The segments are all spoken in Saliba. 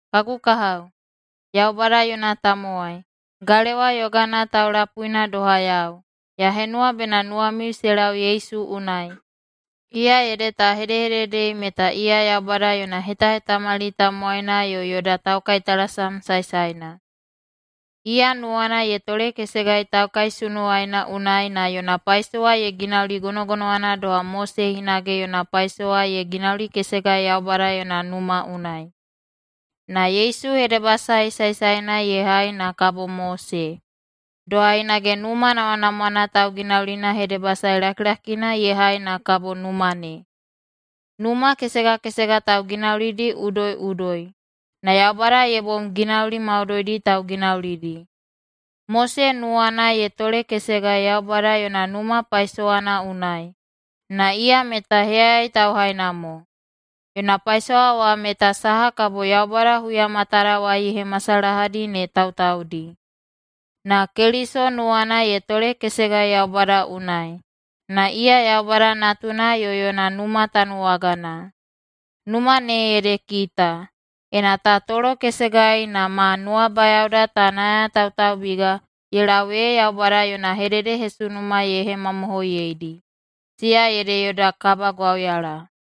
Kagu kahao, Yaubada yona tamowai, galewa yogana taulapuina doha yau, ya henuwa bena nuwamiu se lau Yesu unai, iya ede ta hedehededei meta iya Yaubada yona hetahetamali tamowaina yo yoda taukaitalasam saesaena. Iya nuwana ye tolekesegai taukaisunuwaina unai na yona paisowa ye ginauli gonogonowana doha Mose hinage yona paisowa ye ginaulikesegai Yaubada yona numa unai. Na Yesu hedebasae saesaena ye hai na kabo Mose, doha hinage numa namwanamwana tauginaulina hedebasae lakilakina ye hai na kabo numa ne. Numa kesega kesega tauginaulidi udoiꞌudoi, na Yaubada ye bom ginauli maudoidi tauginaulidi. Mose nuwana ye tolekesegai Yaubada yona numa paisowana unai, na iya meta heyayai tauhaina mo. Yona paisowa wa meta saha kabo Yaubada huya matadawai ye hemasalahadi ne tautaudi. Na Keliso nuwana ye tolekesegai Yaubada unai, na iya Yaubada Natuna yo yona numa tanuwagana. Numa ne ede kita, ena ta tolokesegai na ma nuwabayaoda ta nayatautaubiga ye lau ee Yaubada yona hededehesunuma ye hemamohoiyeidi, siya ede yoda kabagwauyala.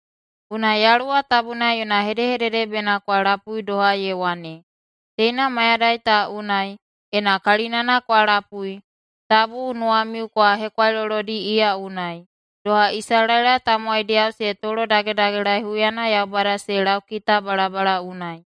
Unai Yaluwa Tabuna yona hedehedede bena kwa lapui, doha ye wane, “Teina mayadai ta unai, ena kalinana kwa lapui, tabu nuwamiu kwa hekwailolodi iya unai, doha Isalaela tamowaidiyao se tolodagedagelaei huyana Yaubada se laukita balabala unai.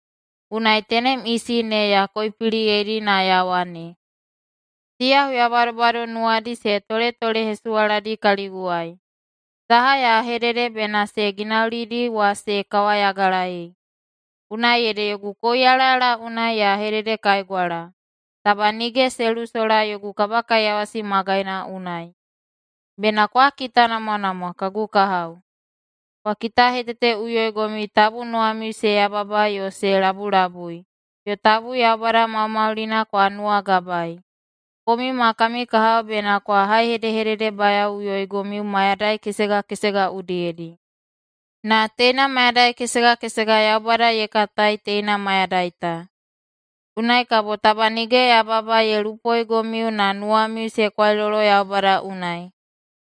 Unai tenem isi ne ya koipiliyeidi na ya wane, ‘Siya huya badobado nuwadi se toletolehesuwaladi kaliguwai. Saha ya hedede bena se ginaulidi wa se kawayagalaei.’ Unai ede yogu kouyalayala unai ya hededekaigwala, ‘Taba nige se lusola yogu kabakaiyawasi magaina unai.’” Bena kwa kitanamwanamwa, kagu kahao. Kwa kitaheteteꞌuyoigomiu tabu nuwamiu se yababa yo se labulabui, yo tabu Yaubada Maumaulina kwa nuwagabaei. Komiu ma kami kahao bena kwa haihedehededehebayaoꞌuyoigomiu mayadai kesega kesega udiyedi. Na teina mayadai kesega kesega Yaubada ye katai “teina mayadai ta”. Unai kabo taba nige yababa ye lupoigomiu na nuwamiu se kwailolo Yaubada unai.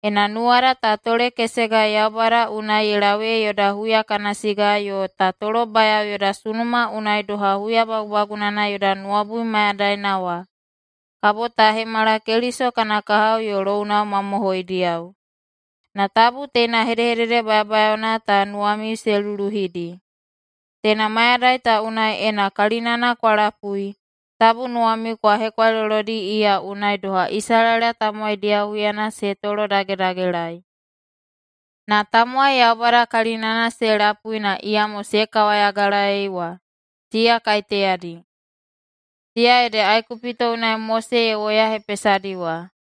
Ena nuwada ta tolekesegai Yaubada unai ye lau ee yoda huya kana siga yo ta tolobayao yoda sunuma unai doha huya bagubagunana yoda nuwabui mayadaina wa, kabo ta hemala Keliso kana kahao yo lounao mamohoidiyao. Na tabu teina hedehedede bayabayaona ta nuwamiu se luluhidi: “Teina mayadai ta unai ena kalinana kwa lapui, tabu nuwamiu kwa hekwailolodi iya unai doha Isalaela tamowaidiyao huyana se tolodagedagelaei.” Na tamowai Yaubada kalinana se lapui na iyamo se kawayagalaei wa, siya kaiteyadi? Siya ede Aikupito unai Mose ye woyahepesadi wa.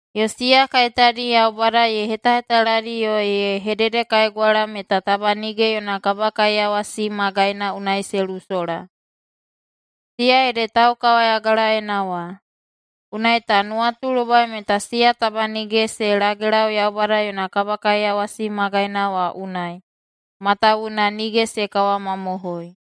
Yo siya kaiteyadi Yaubada ye hetahetaladi yo ye hededekaigwala meta taba nige yona kabakaiyawasi magaina unai se lusola? Siya ede taukawayagalaena wa. Unai ta nuwatulobai meta siya taba nige se lagelau Yaubada yona kabakaiyawasi magaina wa unai, matawuwuna nige se kawamamohoi.